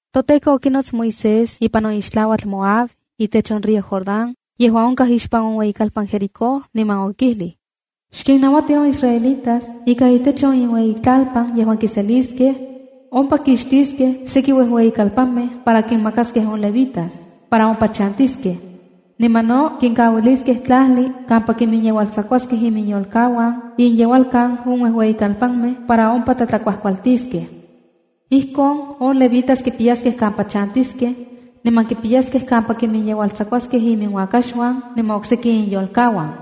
ToTEKO okinots Moisés ipan on ixtlauatl Moab itech on río Jordán yejuan onkaj ixpan on ueyikalpan Jericó, niman okijlij: “Xkinnauati on israelitas ika itech on inueyitlalpan yejuan kiseliskej, ompa kixtiskej seki uejueyikalpanmej para kinmakaskej on levitas, para ompa chantiskej. Niman no kinkauiliskej tlajli kampa kiminyeualtsakuaskej iminyolkauan inyeualkan on uejueyikalpanmej para ompa tlatlakuajkualtiskej. Ijkon on levitas kipiyaskej kampa chantiskej, niman kipiyaskej kampa kiminyeualtsakuaskej iminuakaxuan niman okseki inyolkauan.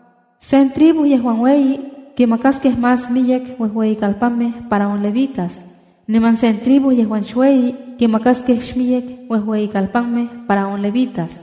Sen tribu yejuan ueyi, kimakaskej más miyek uejueyikalpanmej para on levitas, niman sen tribu yejuan xueyi, kimakaskej xmiyek uejueyikalpanmej para on levitas.”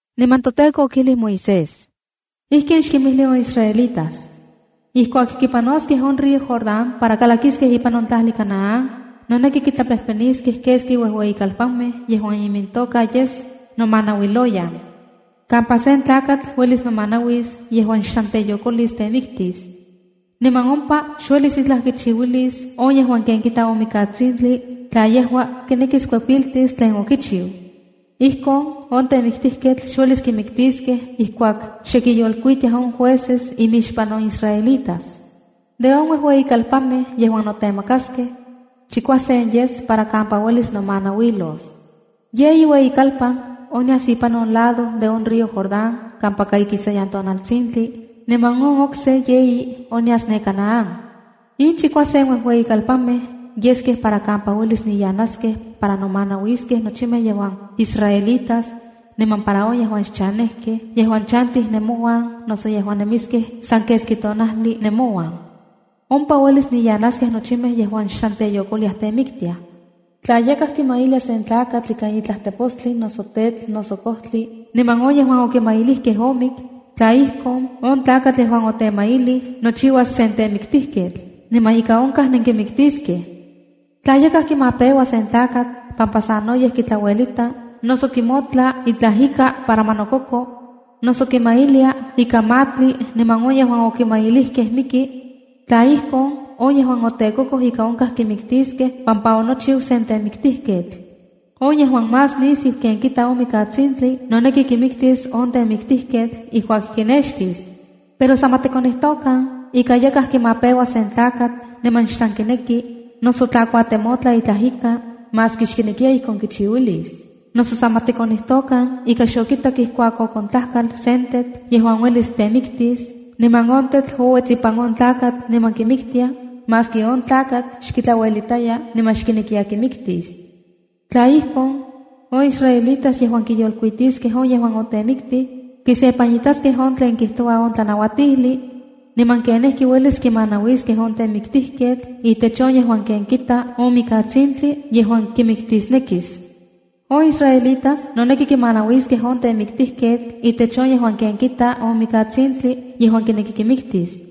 Niman toTEKO okijlij Moisés: “Ijkin xkinmijli on israelitas: ‘Ijkuak kipanoskej on río Jordán para kalakiskej ipan on tlajli Canaán, noneki kitlapejpeniskej keski uejueyikalpanmej yejuan imintoka yes ‘Nomanauiloyan’, kampa sen tlakatl uelis nomanauis yejuan xsan teyokolis temiktis. Niman ompa xuelis itlaj kichiuilis on yejuan ken kita on mikatsintli tla yejua kinekis kuepiltis tlen okichiu. Ijkon on temiktijketl xuelis kimiktiskej ijkuak xe kiyolkuitiaj on jueces imixpan on israelitas. De on uejueyikalpanmej yejuan notemakaskej, chikuasen yes para kampa uelis nomanauilos. Yeyi ueyikalpan onyas ipan on lado de on río Jordán kampaka ikisayan tonaltsintli, niman on okse yeyi onyas ne Canaán. In chikuasen uejueyikalpanmej yeskej para kampa uelis niyanaskej para nomanauiskej nochimej yejuan israelitas, niman para on yejuan xchanejkej yejuan chantij nemouan noso yejuan nemiskej san keski tonajli nemouan. Ompa uelis niyanaskej nochimej yejuan xsan teyokoliaj temiktiaj. ’Tla yakaj kimailia sen tlakatl ikan itlaj tepostli, noso tetl, noso kojtli, niman on yejuan okimailijkej omik, tla ijkon, on tlakatl yejuan otemailij nochiuas sen temiktijketl, niman ika onkaj nenkimiktiskej. ’Tla yakaj kimapeua sen tlakatl pampa sanoyej kitlauelita, noso kimotla itlaj ika para ma nokoko, noso kimajmailia ika matli niman on yejuan okimajmailijkej miki, tla ijkon, on yejuan otekokoj ika onkaj kimikiskej pampa onochiu sen temiktijketl. On yejuan más nisiu ken kita on mikatsintli noneki kimiktis on temiktijketl ijkuak kinextis. ’Pero san ma tikonijtokan ika yakaj kimapeua sen tlakatl niman xsan kineki, noso tla kuatemotla itlaj ika, maski xkinekiya ijkon kichiuiulis. Noso san ma tikonijtokan ika xokitak ijkuak okontlajkal sen tetl yejuan uelis temiktis, niman on tetl ouets ipan on tlakatl niman kimiktia, maski on tlakatl xkitlauelitaya niman xkinekiya kimiktis. Tla ijkon, on israelitas yejuan kiyolkuitiskej on yejuan otemiktij, kisepanitaskej on tlen kijtoua on tlanauatijli, niman kenijki uelis kimanauiskej on temiktijketl itech on yejuan ken kita on mikatsintli yejuan kimiktisnekis. On israelitas noneki kimanauiskej on temiktijketl itech on yejuan ken kita on mikatsintli yejuan kineki kimiktis.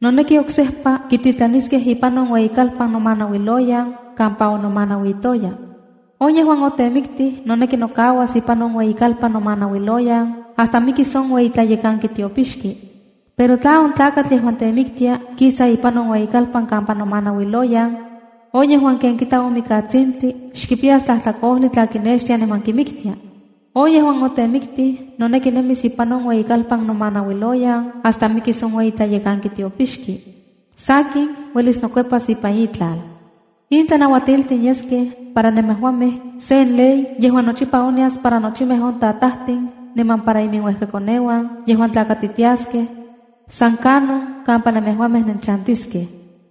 Noneki oksejpa kititlaniskej ipan on ueyikalpan nomanauiloyan kampa onomanauitoya. On yejuan otemiktij noneki nokauas ipan on ueyikalpan nomanauiloyan hasta mikis on ueyi tlayekanki tiopixki. Pero tla on tlakatl yejuan temiktia kisa ipan on ueyikalpan kampa nomanauiloyan, on yejuan ken kita on mikatsintli xkipiyas tlajtlakojli tla kinextia niman kimiktia. On yejuan otemiktij noneki nemis ipan on ueyikalpan nomanauiloyan hasta mikis on ueyi tlayekanki tiopixki. Sakin, uelis nokuepas ipan itlal. ’In tlanauatiltin yeskej para nemejuamej sen ley yejuan nochipa onyas para nochimej on tatajtin niman para iminuejkakoneuan yejuan tlakatitiaskej, san kanon kampa nemejuamej nenchantiskej.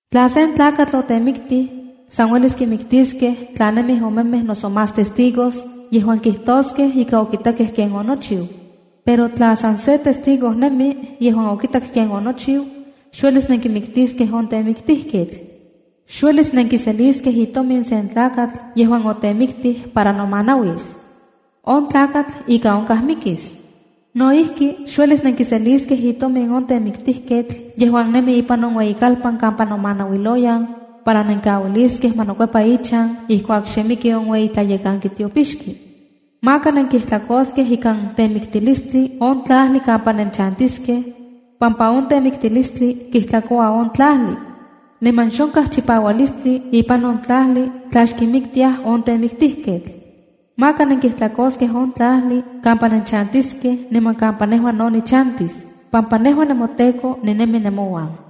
’Tla sen tlakatl otemiktij, san uelis kimiktiskej tla nemij omemej noso más testigos, yejuan kijtoskej ika okitakej ken onochiu. Pero tla san se testigo nemi yejuan okitak ken onochiu, xuelis nenkimiktiskej on temiktijketl. ’Xuelis nenkiseliskej itomin sen tlakatl yejuan otemiktij para nomanauis. On tlakatl, ika onkaj mikis. ’No ijki, xuelis nenkiseliskej itomin on temiktijketl yejuan nemi ipan on ueyikalpan kampa nomanauiloyan para nenkauiliskej ma nokuepa ichan ijkuak xe miki on ueyi tlayekanki tiopixki. ’Maka nenkijtlakoskej ikan temiktilistli on tlajli kampa nenchantiskej, pampa on temiktilistli kijtlakoua on tlajli. Niman xonkaj chipaualistli ipan on tlajli tla xkimiktiaj on temiktijketl’ ’Maka nenkijtlakoskej on tlajli kampa nenchantiskej niman kampa nejua no nichantis, pampa nejua nemoTEKO ninemi nemouan.”